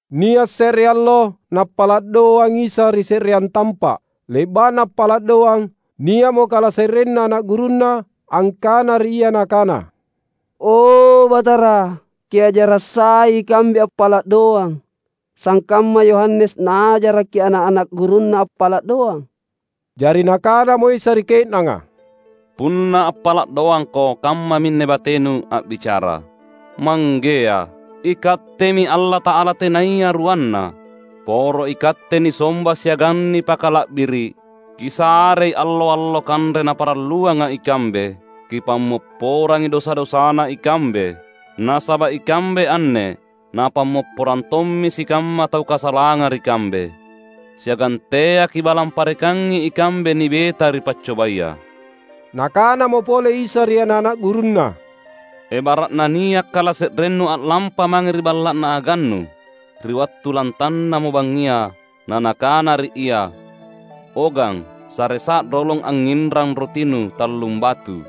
Nia’ se’re allo Nappala’ doang Isa ri se’reang tampa’. Le’ba’na appala’ doang, nia’mo kalase’renna ana’ gurunNa angkana ri Ia nakana, "O Batara, Kiajara’ sai ikambe appala’ doang, sangkamma Yohanes naajaraki ana’-ana’ gurunna appala’ doang." Jari Nakanamo Isa ri ke’nanga, "Punna appala’ doangko, kammaminne batenu a’bicara, ‘Manggea, IKattemi Allata’ala Tenaya Ruanna. Poro iKatte nisomba siagang nipakala’biri’. Kisarei allo-allo kanre naparalluanga ikambe. Kipammopporangi dosa-dosana ikambe, Nasaba’ ikambe anne napammopporang tommi sikamma tau kasalanga ri kambe. Siagang teaKi’ balang parekangi ikambe nibeta ri paccobaya.’" Nakanamo pole Isa ri ana’-ana’ gurunNa, "Ebara’na nia’ kalase’rennu a’lampa mange ri balla’na agannu ri wattu lantannamo bangngia, na nakana ri ia, ‘O gang, saresa’ rolong angnginrang rotinu tallumbatu,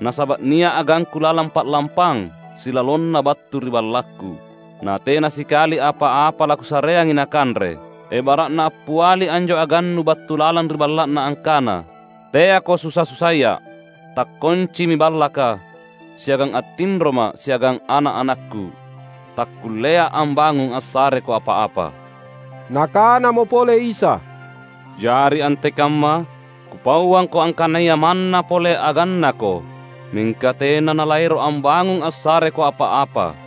nasaba’ nia’ agangku lalang pa’lampang, silalonna battu ri ballakku, natena sikali apa-apa lakusareangi nakanre!’ Ebara’na appiali anjo agannu battu lalang ri balla’na angkana, ‘Teako susa-susaia’! Takkoncimi ballaka, siagang attinroma’ siagang ana’-anakku. Takkullea’ ambangung assareko apa-apa.’" Nakanamo pole Isa, "Jari antekamma? Kupauangko angkanaya manna pole agannako, mingka tena nalaero’ ambangung assareko apa-apa.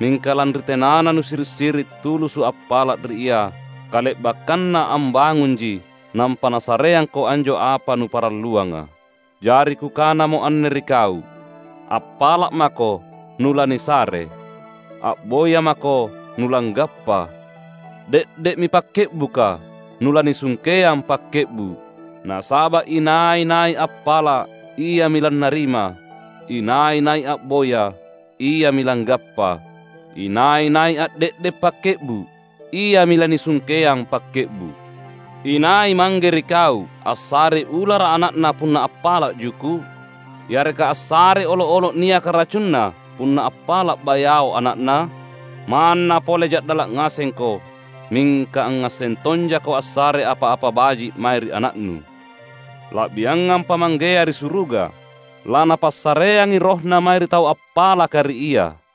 Mingka lanri tenana nusiri’-siri’ tulusu’ appala’ ri ia, kale’bakkanna ambangunji nampa nasareangko anjo apa nuparalluanga. Jari Kukanamo anne ri kau: Appala’ mako nulanisare; a’boya mako nulanggappa; de’de’mi pakke’buka, nulanisungkeang pakke’bu’. Nasaba’ inai-nai appala’, iami lannarima; inai-nai a’boya, iami langgappa; inai-nai a’de’de’ pakke’bu’, iami lanisungkeang pakke’bu’. Inai mangge ri kau assarei ulara’ ana’na punna appala’ juku’? Yareka assarei olo’-olo’ niaka racunna, punna appala’ bayao ana’na? Manna pole ja’dala’ ngasengko, mingka angngasseng tonjako assare apa-apa baji’ mae ri ana’nu. La’biangampa Manggea ri suruga! LaNapassareangi RohNa mae ri tau appalaka ri Ia!"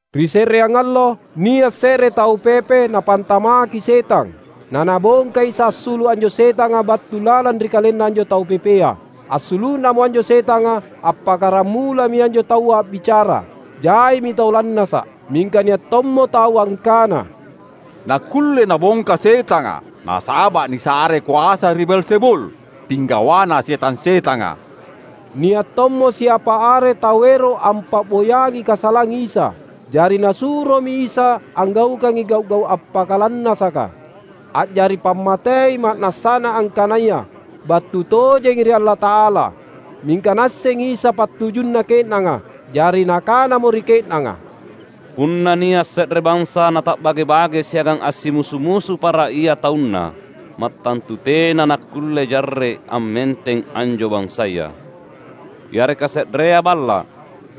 Ri se’reang allo, nia’ se’re tau pepe napantamakki setang, na Nabongka Isa assulu’ anjo setanga battu lalang ri kalenna anjo tau pepea. Assulu’namo anjo setanga, appakkaramulami anjo taua a’bicara. Jaimi tau lannasa’. Mingka nia’ tommo tau angkana, "Nakkulle Nabongka setanga, nasaba’ nisarei koasa ri Beelzebul, Pinggawana setang-setanga." Nia’ tommo siapa are tau ero’ ampa’boyangi kasalang Isa. Jari nasuromi Isa anggaukangi gau’-gau’ appakalannasaka, a’jari pammatei ma’nassana angkanaya battu tojengi ri Allata’ala. Mingka Naassengi Isa pattujunna ke’nanga. Jari Nakanamo ri ke’nanga, "Punna nia’ se’re bansa nata’bage-bage siagang assimusu-musu para ia taunna, mattantu tena nakkulle jarre’ ammenteng anjo bansaya. Yareka se’rea balla’,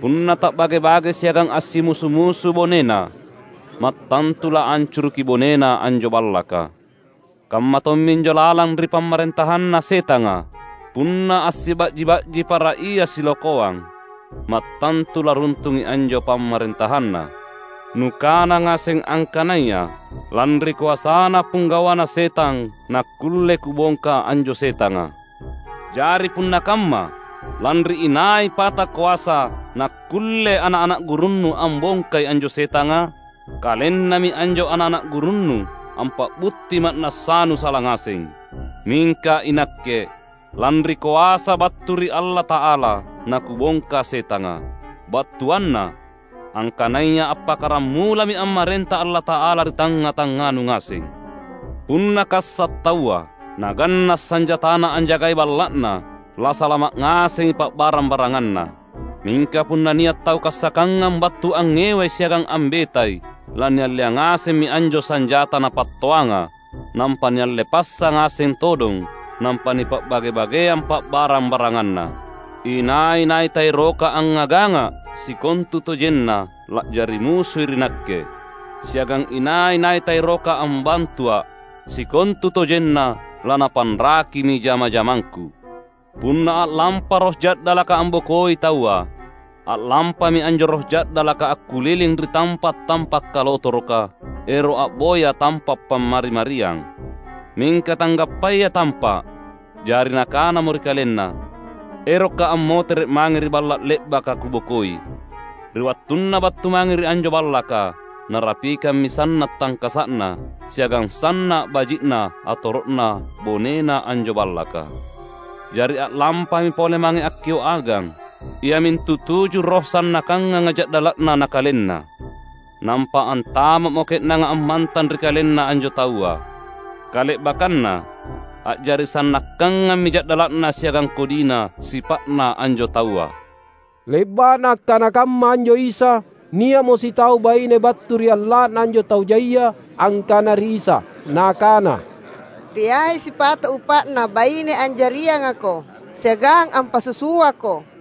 punna ta’bage-bage siagang assimusu-musu bonena, mattantu laancuruki bonena anjo ballaka. Kamma tomminjo lalang ri pamarentahanna Setanga; punna assiba’ji-ba’ji para ia silokoang, mattantu laruntungi anjo pamarentahanna. Nukana ngaseng angkanaya lanri koasana Pinggawana Setang nakkulle Kubongka anjo setanga. Jari punna kamma, lanri inai pata koasa nakkulle ana’-ana’ gurunnu ambongkai anjo setanga? Kalennami anjo ana’-ana’ gurunnu ampa’butti ma’nassanu sala ngaseng! Mingka iNakke, lanri koasa battu ri Allata’ala naKubongka setanga. Battuanna, angkanaya appakkaramulami ammarenta Allata’ala ri tangnga-tangnganu ngaseng. Punna kassa’ taua, naganna’ sanjatana anjagai balla’na, lasalama’ ngasengi pa’barang-baranganna. Mingka punna nia’ tau kassakkangang battu angngewai siagang ambetai, lanialleang ngasemmi anjo sanjata napattoanga, nampa nialle passa ngaseng todong nampa nipa’bage-bageang pa’barang-baranganna. Inai-nai taeroka angngagangangA’, sikontutojenna la’jari musui ri Nakke. Siagang inai-nai taeroka ambantuA’, sikontutojenna lanapanrakimi jama-jamangKu!" "Punna a’lampa roh ja’dalaka ambokoi taua, a’lampami anjo roh ja’dalaka akkuliling ri tampa’-tampa’ kalotoroka, ero’ a’boya tampa’ pammari-mariang. Mingka tanggappayai tampa’. Jari nakanamo ri kalenna, ‘Erokka’ ammotere’ mange ri balla’ le’baka kubokoi!’ Ri wattunna battu mange ri anjo ballaka, narapikammi sanna’ tangkasa’na siagang sanna’ baji’na atoro’na bonena anjo ballaka. Jari a’lampami pole mange akkio’ agang, iamintu tuju roh sannakkanganga ja’dala’na nakalenna. Nampa antama’mo ke’nanga ammantang ri kalenna anjo taua. Kale’bakkanna, a’jari sannakkangammi ja’dala’na siagang kodina sipa’na anjo taua." Le’ba’na akkana kamma anjo Isa, nia’mo sitau baine battu ri alla’na anjo tau jaia angkana ri Isa, nakana, "Teai sipato’ upa’na baine anjariangaKo siagang ampasusuaKo!"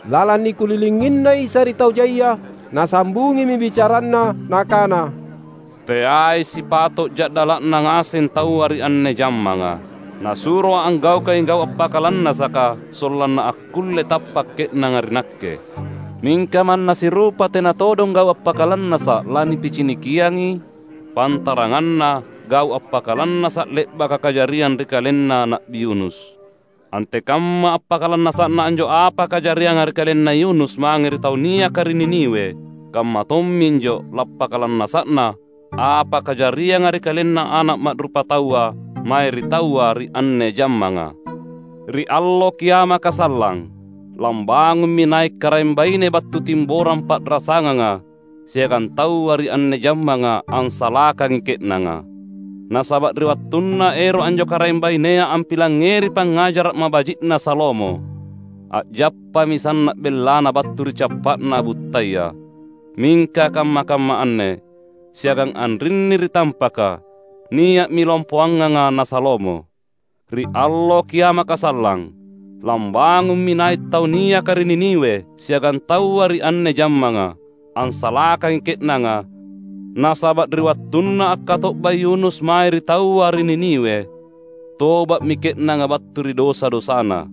Lalang nikulilinginNa Isa ri tau jaia, Nasambungimi bicaranNa Nakana, "Teai sipato’ ja’dala’na ngaseng taua ri anne jammanga. NasuroA’ anggaukangi gau’ appakalannasaka sollanna akkulle tappa’ ke’nanga ri Nakke. Mingka manna sirupa tena todong gau’ appakalannasa’ lanipicinikiangi, pantaranganna gau’ appakalannasa’ le’baka kajariang ri kalenna Na’bi Yunus. Antekamma appakalannasa’na anjo apa kajarianga ri kalenna Yunus mange ri tau niaka ri Niniwe, kamma tomminjo lappakalannasa’na apa kajarianga ri KalenNa Ana’ Ma’rupataua mae ri taua ri anne jammanga. Ri allo kiamaka sallang, lambangummi nai’ Karaeng baine battu Timborang pa’rasanganga siagang taua ri anne jammanga, ansalakangi ke’nanga. Nasaba’ ri wattunna ero’ anjo Karaeng bainea ampilangngeri pangngajara’ mabaji’na Salomo, a’jappami sanna’ bellana battu ri cappa’na buttaya. Mingka kamma-kamma anne, siagang anrinni ri tampaka, nia’mi lompoanganga na Salomo! Ri allo kiamaka sallang, lambangummi nai’ tau niaka ri Niniwe siagang taua ri anne jammanga, ansalakangi ke’nanga nasaba’ ri wattunna akkato’ba Yunus mae ri taua ri Niniwe, toba’mi ke’nanga battu ri dosa-dosana.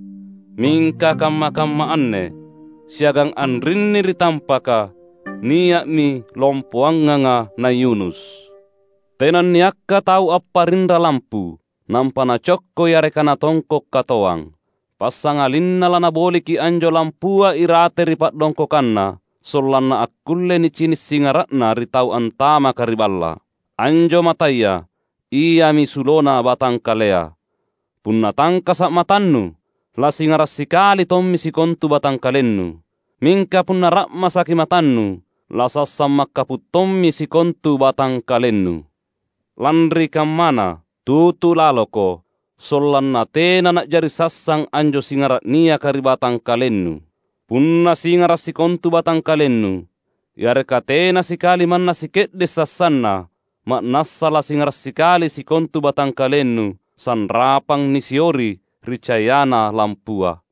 Mingka kamma-kamma anne, siagang anrinni ri tampaka nia’mi lompoanganga na Yunus!" "Tenanniakka tau apparinra lampu, nampa nacokko yareka natongko’ katoang. Passangalinna lanaboliki anjo lampua irate ri pa’dongkokanna, sollanna akkulle nicini’ singara’na ri tau antamaka ri balla’. Anjo mataya iami sulona batangkalea. Punna tangkasa’ matannu, lasingara’ sikali tommi sikontu batangkalennu. Mingka punna ra’masaki matannu, lasassang makkapu’ tommi sikontu batangkalennu. Lanri kammana, tutu laloko, sollanna tena na’jari sassang anjo singara’ niaka ri batangkalennu. Punna singara’ sikontu batangkalennu, yareka tena sikali manna sike’de’ sassanna, ma’nassa lasingara’ sikali sikontu batangkalennu, sanrapang nisiori ri cayana lampua."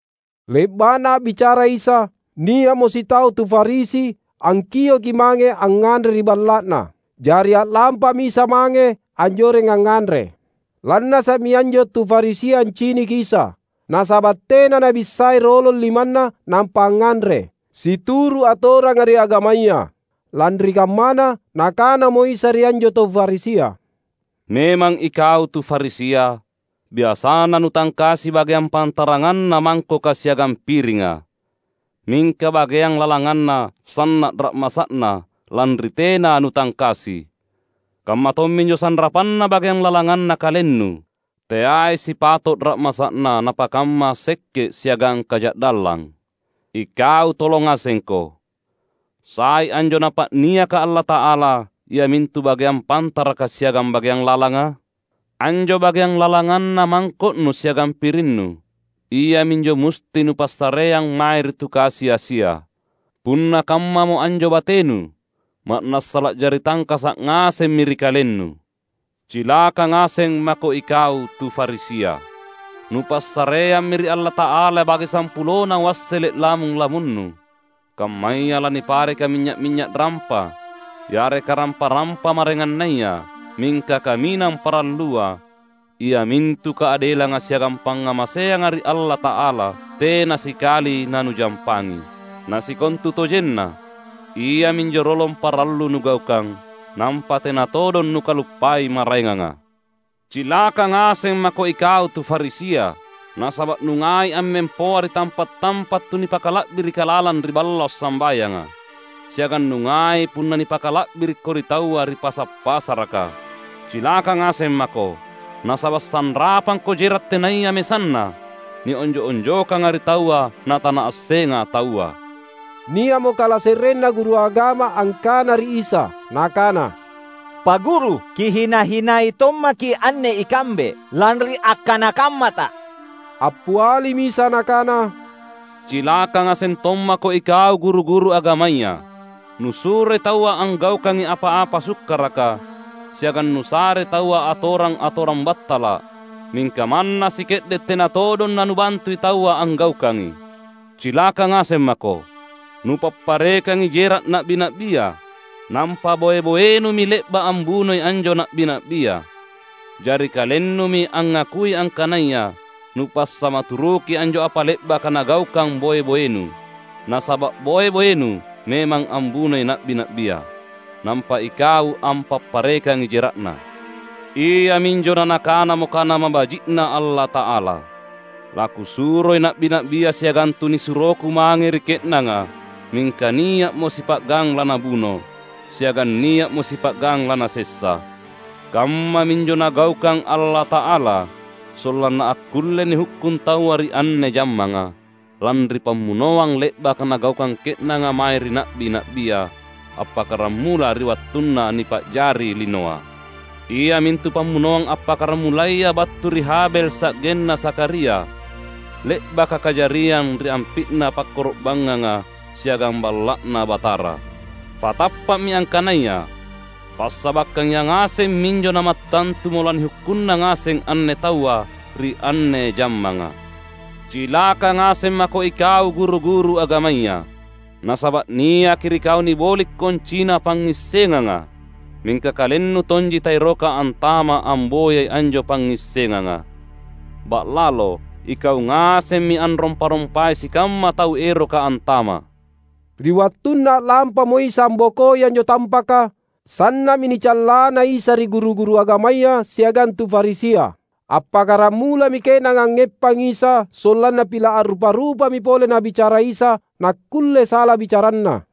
Le’ba’na a’bicara Isa, nia’mo sitau tu Farisi angkioki mange angnganre ri balla’na. Jari a’lampami Isa mange anjoreng angnganre. Lannasa’mi anjo tu Farisia anciniki Isa, nasaba’ tena Nabissai rolong limanNa nampa angnganre, situru’ atoranga ri agamaya. Lanri kammana, Nakanamo Isa ri anjo tu Farisia, "Memang ikau tu Farisia, biasana nutangkasi bageang pantaranganna mangkoka siagang piringa; mingka bageang lalanganna sanna’ ra’masa’na lanri tena nutangkasi. Kamma tomminjo sanrapanna bageang lalanganna kalennu, teai sipato’ ra’masa’na napakamma sekke’ siagang kaja’dallang. Ikau tolo ngasengko! Sai anjo Napa’niaka Allata’ala iamintu bageang pantaraka siagang bageang lalanga? Anjo bageang lalanganna mangko’nu siagang pirinnu, iaminjo musti nupassareang mae ri tu kasi-asia. Punna kammamo anjo batenu, ma’nassa la’jari tangkasa’ ngasemmi ri kalennu. Cilaka ngaseng mako ikau tu Farisia! Nupassareammi ri Allata’ala bage sampulona wassele’ lamung-lamunnu, kammaya lanipareka minynya’-minynya’ rampa, yareka rampa-rampa maraengannaya; mingka kaminang parallua, iamintu kaadelanga siagang pangngamaseanga ri Allata’ala, tena sikali nanujampangi. Na sikontutojenna iaminjo rolong parallu nugaukang, nampa tena todong nukaluppai maraenganga. Cilaka ngaseng mako ikau tu Farisia! Nasaba’ nungai ammempoa ri tampa’-tampa’ tu nipakala’birika lalang ri balla’ sambayanga, siagang nungai punna nipakala’birikko ri taua ri pasa’-pasaraka. Cilaka ngaseng mako! Nasaba’ sanrapangko jera’ tenaya mesanna, nionjo’-onjokanga ri taua natanaassenga taua." Nia’mo kalase’renna guru agama angkana ri Isa, nakana, "Pa’ Guru, Kihina-hinai tommaki’ anne ikambe, lanri akkana kammaTa!" Appialimi Isa Nakana, "Cilaka ngaseng tommako ikau guru-guru agamaya! Nusuroi taua anggaukangi apa-apa sukkaraka, siagang nusarei taua atorang-atorang battala’; mingka manna sike’de’ tena todong nanubantui taua anggaukangi. Cilaka ngaseng mako! Nupapparekangi jera’ na’bi-na’bia, nampa boe-boenumi le’ba’ ambunoi anjo na’bi-na’bia. Jari kalennumi angngakui angkanaya nupassamaturuki anjo apa le’baka nagaukang boe-boenu; nasaba’ boe-boenu memang ambunoi na’bi-na’bia, nampa ikau ampapparekangi jera’na. Iaminjo na nakanamo Kana mabaji’Na Allata’ala, ‘LaKusuroi na’bi-na’bia siagang tunisuroKu mange ri ke’nanga; mingka nia’mo sipa’gang lanabuno, siagang nia’mo sipa’gang lanasessa!’ Kammaminjo Nagaukang Allata’ala, sollanna akkulle nihukkung taua ri anne jammanga, lanri pammunoang le’baka nagaukang ke’nanga mae ri na’bi-na’bia, appakkaramula ri wattunna nipa’jari linoa. Iamintu pammunoang appakkaramulaya battu ri Habel sa’genna Zakharia, le’baka kajariang ri ampi’na pakkoro’bangnganga siagang Balla’Na Batara. Patappa’mi angkanaya: Passabakkang yangaseng minjo namattantumo lanihukkunna ngaseng anne taua ri anne jammanga. Cilaka ngaseng mako ikau guru-guru agamaya. Nasaba’ niaki ri kau niboli’ koncina pangngissenganga. Mingka kalennu tonji taeroka antama’ amboyai anjo pangngissenganga. Ba’lalo, ikau ngasemmi anrompa-rompai sikamma tau eroka antama’!" Ri wattunna a’lampamo Isa ambokoi anjo tampaka, sanna’mi nicallana Isa ri guru-guru agamaya siagang tu Farisia. Appakkaramulami ke’nanga angngeppangi Isa sollanna pila’ a’rupa-rupami pole Nabicara Isa, nakkulle sala bicaraNa.